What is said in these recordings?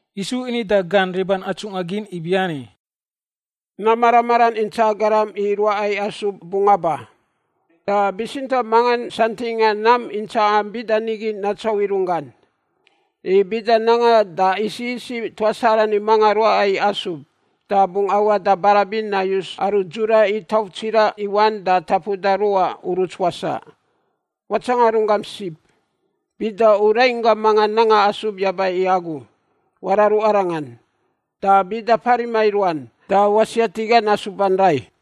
Yisu ini da gan riban atsungꞌa gin ibiani, “Nam mara maran intsaꞌa garam i ruaꞌa i asub bungꞌ aba. Da bitsintaꞌ mangan santingꞌa nam intsaꞌan bida nigi natsauꞌ i runggan. I bida nangan da isiꞌ isiꞌ tuas arani mangan ruaꞌa i asub, da bungꞌ awaꞌ da barabin nayus aru dzura i tauf tsiraꞌ i wan da tapuda ruꞌa uruts wasaꞌ. Watsanga runggam sib. “Bida u rainggam mangan nanga asub yaba i agu, wararu arangan, da bida parima i ruan da wasiat i gan asuban rai.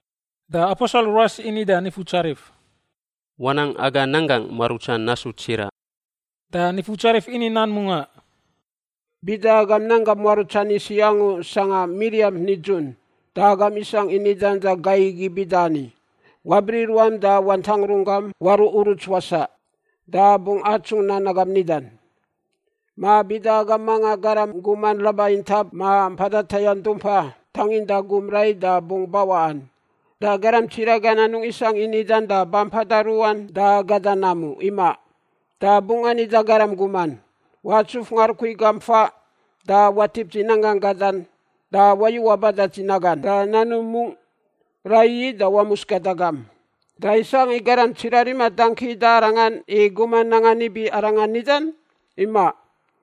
Da aposel ruas ini da Nifutsarif, “Wanang aga nanggangꞌ muarutsan nasu tsiraꞌ.” Da Nifutsarif ini nan mungaꞌ, “Bida agam nanggam muarutsan isiꞌ angu sangꞌa miriamp nidzun da agam isangꞌ i nidan da gai igi bida ani, ‘Wabriꞌ ruam da wantangꞌ runggam waruꞌ uruts wasaꞌ,’ da bungꞌ atsungꞌ nan agam nidan! “Ma bida agam mangan garam guman raba intap ma mpada tayangꞌ dumpa tanginda gum rai da bungꞌ bawaꞌan, da garam tsiraꞌ gan anungꞌ isangꞌ i nidan da ba mpada ruꞌan da gada nam u, imaꞌ. Da bungꞌ ani da garam guman, ‘Watsuf ngarukui gam faꞌ da watip dzi nanggangꞌ gadan da wayu waba da dzi nagan da nanum mungꞌ, raiyi da wamus gada gam.’ Da isangꞌ i garam tsiraꞌ rima dangki da arangan i guman nangan ibi arangan nidan? Imaꞌ.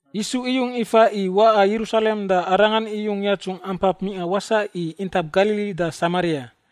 Yisu iyung ifa i waꞌa Yerusalem da Arangan iyung yatsungꞌ ampap mingꞌa wasaꞌ i intap Galili da Samaria.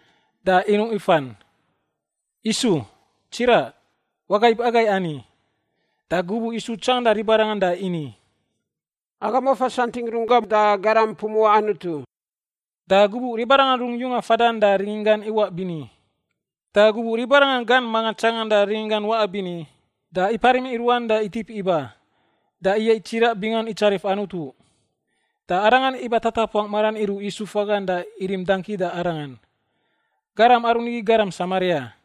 da inuꞌ ifan, “Yisu, Tsiraꞌ, wagaib agai ani!” Da gubuꞌ Yisu tsanganda ribarangan da ini, “Agam wafa santingꞌ runggam da garam pumuꞌa Anutu.” Da gubuꞌ ribarangan rungꞌ yunga fadan da rininggan iwaꞌ bini. Da gubuꞌ ribarangan gan mangan tsanganda rininggan waꞌa bini, da iparim i ruan da itip iba, da iyaiꞌ tsiraꞌ bingan itsarif Anutu. Da arangan iba tatapuangꞌ maran iruꞌ Yisu fagan da irim dangki da Arangan. Garam aru nigi garam Samaria.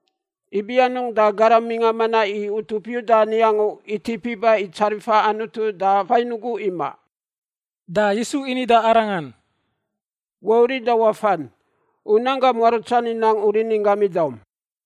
Ibi anungꞌ da garam mingꞌa manaꞌ i utup Yuda ani angu itip iba i tsarifa Anutu da fain ugu imaꞌ?” Da Yisu ini da arangan, “Wauriꞌ da wafan; u nanggam muarutsan inang u rininggam idaum.”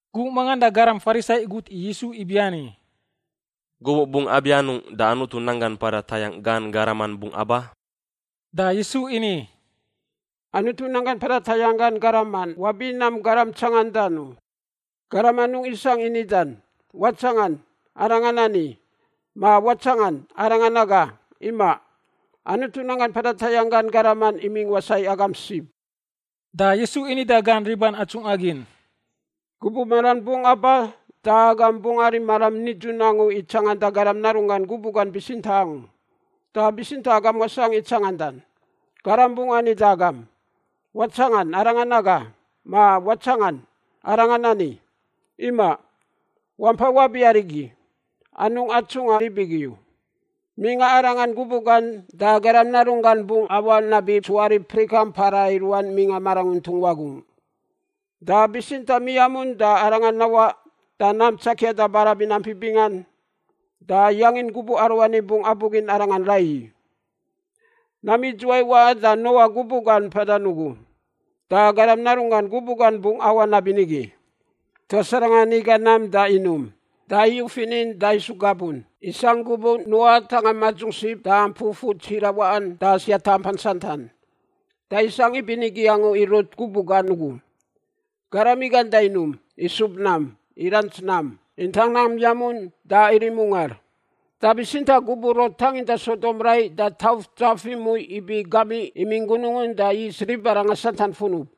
Gubuꞌ mangan da garam Farisai igut i Yisu ibiani, “Gubuꞌ bungꞌ abianungꞌ da Anutu nanggan mpada tayangꞌ gan garaman bungꞌ aba?” Da Yisu ini, “Anutu nanggan mpada tayangꞌ gan garaman wabi nam garam tsangandan u. Garam anungꞌ isangꞌ i nidan, ‘Watsangan! Arangan ani,’ ma ‘Watsangan! Arangan aga.’ Imaꞌ. Anutu nanggan mpada tayangꞌ gan garaman imingꞌ wasaꞌ i agam sib.” Da Yisu ini da gan riban atsungꞌa gin, “Gubuꞌ maran bungꞌ aba da agam bungꞌ arim maram nidzun angu i tsanganda Garam Narunggan gubuꞌ gan bitsintaꞌ angu, da bitsintaꞌ agam wasangꞌ i tsangandan. Garam bungꞌ ani da agam, ‘Watsangan! Arangan aga,’ ma ‘Watsangan! Arangan ani.’ Imaꞌ. Wampai wabi arigi; anungꞌ atsungꞌa rib igi u. Mingꞌa arangan gubuꞌ gan da Garam Narunggan bungꞌ awaꞌ nabi tsuarip prikan mpara i ruan mingꞌa maranguntung wagungꞌ. Da bitsintaꞌ miamun da arangan nawaꞌ da nam tsakia da barabin ampi bingan da yangin gubuꞌ aruani bungꞌ abugin arangan raiyi. “Nam idzuwai waꞌan da Noa gubuꞌ gan mpadan ugu, da Garam Narunggan gubuꞌ gan bungꞌ awaꞌ nabinigi. Tuas arangan iga nam da inum, da iyu finin da isu gabun isangꞌ gubuꞌ Noa atangꞌa madzung sib da mpui fur tsiraꞌ waꞌan da siata ampan santan. Da isangꞌ ibinigi angu i Lot gubuꞌ gan ugu. Garam igan da inum, isub nam, irants nam, intang nam yamun da irim ungar. Da bitsintaꞌ gubuꞌ Lot tanginda Sodom rai da tauf dzaf imui ibi gamiꞌ imingꞌ gunungun da is ribarangan santan funub.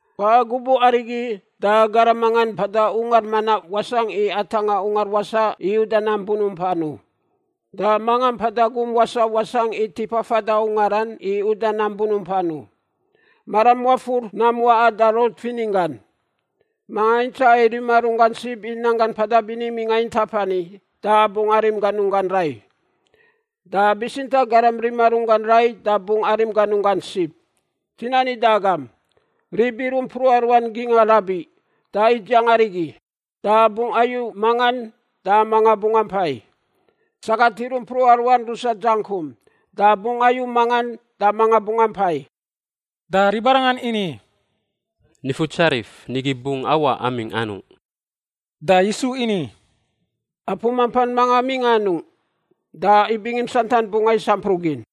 Waꞌa gubuꞌ arigi da garam mangan mpada ungar manaꞌ wasangꞌ i atangꞌa ungar wasaꞌ i uda nam bunumpan u. Da manga mpada gum wasaꞌ wasangꞌ i tipa fada ungaran i uda nam bunumpan u. Maram wafur nam waꞌan da Lot fininggan. Manga intsaꞌa i rima runggan sib i nanggan mpada bini mingꞌa intap ani da bungꞌ arim ganunggan rai, da bitsintaꞌ garam rima runggan rai da bungꞌ arim ganunggan sib. Dzi nani da agam, rib iruꞌ mpruꞌa ruan gingꞌa rabiꞌ da idziang arigi, da bungꞌ ayu mangan da mangan bungꞌ ampai. Sagat iruꞌ mpruꞌa ruan rusa dzangkum, da bungꞌ ayu mangan da manga bungꞌ ampai.” Da ribarangan ini, “Nifutsarif, nigi bungꞌ awaꞌ amingꞌ anungꞌ?” Da Yisu ini, “Apu mampan mangan mingꞌa anungꞌ, da ibingimp santan bungꞌ ais ampruꞌ gin.”